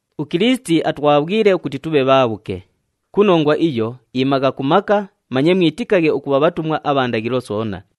UKilisiti atwabhwile ukuti tubhe bhaabhuke. Ku nongwa iyo, imagha ku maka, manye mwitikaghe ukubha bhatumwa abha ndaghilo soona.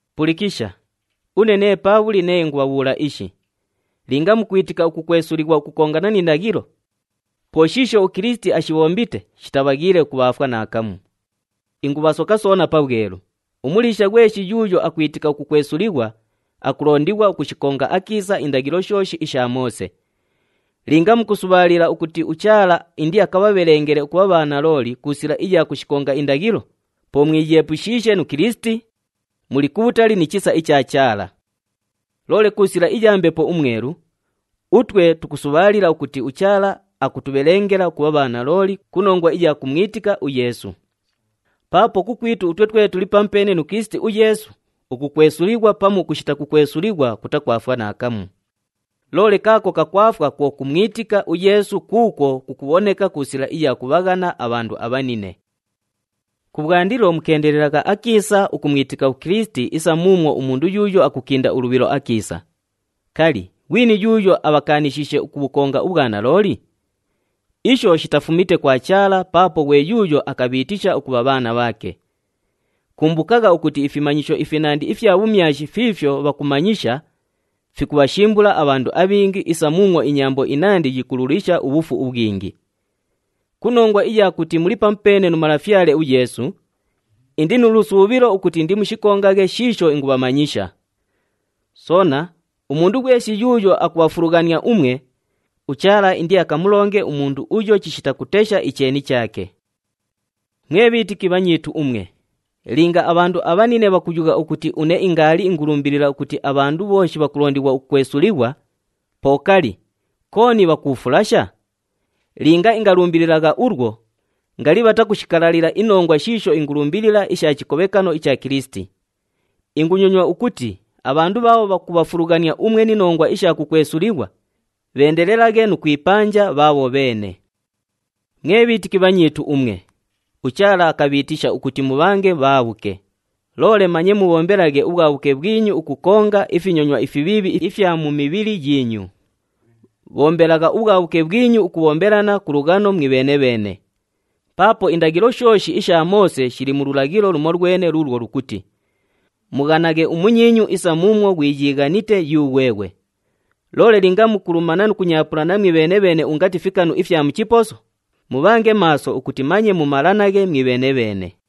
Pulikisha, une nee Paabhuli nee ingubhabhuula ishi. Linga mukwitika ukukwesulighwa ukukongana ni ndaghilo, po shiisho uKilisiti ashibhombite shitabhaghiile ukubhaafwa naakamu. Ingubhasoka soona pabhwelu, umuliisha ghweshi yuuyo akwitika ukukwesulighwa, akulondighwa ukushikonga akiisa indaghilo shooshi isha Moose. Linga mukusubhaalila ukuti uChaala indiabhabhelengele ukubha bhanalooli ku sila iya kushikonga indaghilo, po mwiyeepushiishe nu Kilisiti, muli kubhutali ni chisa icha Chaala. Loole ku sila iya Mbepo uMwelu, utwe tukusubhaalila ukuti uChaala akutubhelengela ukubha bhanalooli ku nongwa iya kumwitika uYeesu. Paapo kukwitu utwe twe tuli pamupeene nu Kilisiti uYeesu, ukukwesulighwa pamu ukushita kukwesulighwa kutakwafwa naakamu. Loole kaako kakwafwa kwo kumwitika uYeesu kuukwo kukubhoneka ku sila iya kubhaghana abhandu abhanine. Kubhwandilo mukeendelelagha akiisa ukumwitika uKilisiti isa muumwo umundu yuuyo akukinda ulubhilo akiisa! Kali, ghwini yuuyo abhakaanishiishe ukubhukonga ubhwanalooli? Isho shitafumite kwa Chaala paapo ghwe yuuyo akabhiitisha ukubha bhaana bhaake. Kumbukagha ukuti ifimanyisho ifinandi ifya bhumyashi fiifyo bhakumanyisha fikubhashimbula abhandu abhingi isa muumwo inyambo inandi yikululisha ubhufu ubhwingi. Ku nongwa iya kuti muli pamupeene nu Malafyale uYeesu, indi nu lusuubhilo ukuti indimushikongaghe shiisho ingubhamanyisha. Soona, umundu ghweshi yuuyo akubhafulughania umwe, uChaala indiakamulonge umundu uyo chishita kutesha icheeni chaake. Mwe bhiitiki bhanyiitu umwe, linga abhandu abhanine bhakuyugha ukuti une ingaali ingulumbilila ukuti abhandu bhooshi bhakulondighwa ukukwesulighwa, po kali, kooni bhakuufulasha? Linga ingalumbililagha ulwo, ngali bhatakushikalalila inongwa shiisho ingulumbilila isha chikobhekano icha Kilisiti. Ingunyonywa ukuti abhandu bhaabho bhakubhafulughania umwe ni nongwa isha kukwesulighwa bheendelelaghe nu kwipanja bhaabho bheene! Mwe bhiitiki bhanyiitu umwe, uChaala akabhiitisha ukuti mubhange bhaabhuke. Loole manye mubhombelaghe ubhwabhuke bhwinyu ukukonga ifinyonywa ifibhiibhi ifya mu mibhili yiinyu. Bhombelagha ubhwabhuke bhwinyu ukubhombelana ku lughano mwibheene-bheene. Paapo indaghilo shooshi isha Moose shili mu lulaghilo lumolwene luulwo lukuti, “Mughanaghe umunyiinyu isa muumwo ghwiyiighanite yughweghwe.” Loole linga mukulumana nu kunyaapulana mwibheene-bheene ungati fikanu ifya mu chiposo, mubhange maaso ukuti manye mumalanaghe mwibheene-bheene.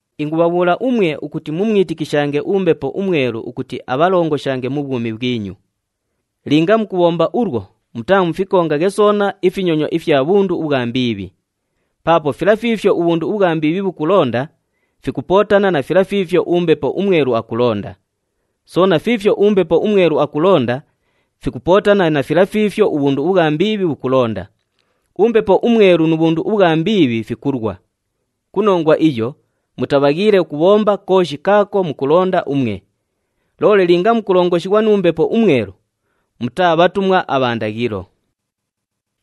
Ingubhabhuula umwe ukuti mumwitikishange uMbepo uMwelu ukuti abhalongoshange mu bhwumi bhwinyu. Linga mukubhomba ulwo, mutaamukafikonge soona ifinyonywa ifya bhundu ubhwa mbiibhi. Paapo fila fiifyo ubhundu ubhwa mbiibhi bhukulonda, fikupootana na fila fiifyo uMbepo uMwelu akulonda. Soona fiifyo uMbepo uMwelu akulonda, fikupootana na fila fiifyo ubhundu ubhwa mbiibhi bhukulonda. UMbepo uMwelu nu bhundu ubhwa mbiibhi fikulwa. Ku nongwa iyo, mutabhaghiile ukubhomba kooshi kaako mukulonda umwe. Loole linga mukulongoshighwa nu Mbepo uMwelu, mutaa bhatumwa abha ndaghilo.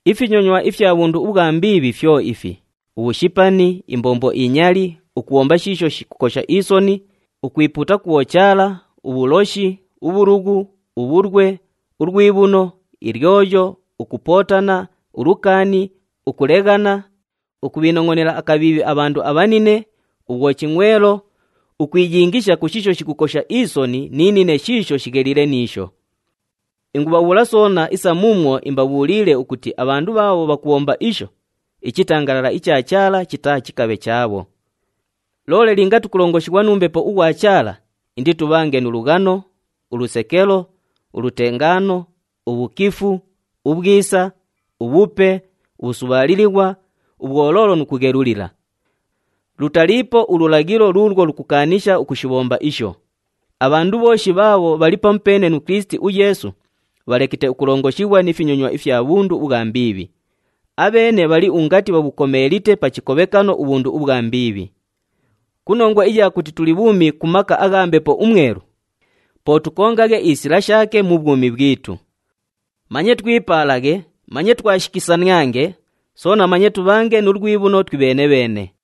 Ifinyonywa ifya bhundu ubhwa mbiibhi fyo ifi: ubhushipani, imbombo inyali, ukubhomba shiisho shikukosha isoni, ukwipuuta ku bhochaala, ubhuloshi, ubhulughu, ubhulwe, ulwibhuno, ilyoyo, ukupootana, ulukaani, ukuleghana, ukubhiinongʼonela akabhiibhi abhandu abhanine, ubhwochingʼwelo, ukwiyingisha ku shiisho shikukosha isoni ni nine shiisho shigheliile ni isho. Ingubhabhuula soona isa muumwo imbabhuuliile ukuti abhandu bhaabho bhakubhomba isho, ichitangalala icha Chaala chitaachikabhe chaabho. Loole linga tukulongoshighwa nu Mbepo ughwa Chaala, inditubhange nu lughano, ulusekelo, ulutengaano, ubhukifu, ubhwisa, ubhupe, ubhusubhaalilighwa, ubhwoloolo nu kughelulila. Lutaliipo ululaghilo luulwo lukukaanisha ukushibhomba isho. Abhandu bhooshi bhaabho bhali pamupeene nu Kilisiti uYeesu, bhalekite ukulongoshighwa ni finyonywa ifya bhundu ubhwa mbiibhi. Abheene bhali ungati bhabhukomeelite pa chikobhekano ubhundu ubhwa mbiibhi. Ku nongwa iya kuti tuli bhuumi ku maka agha Mbepo uMwelu, po tukongaghe isila shaake mu bhwumi bhwitu. Manye twipaalaghe, manye twashikisaniange, soona manye tubhange nu lwibhuno twibheene-bheene.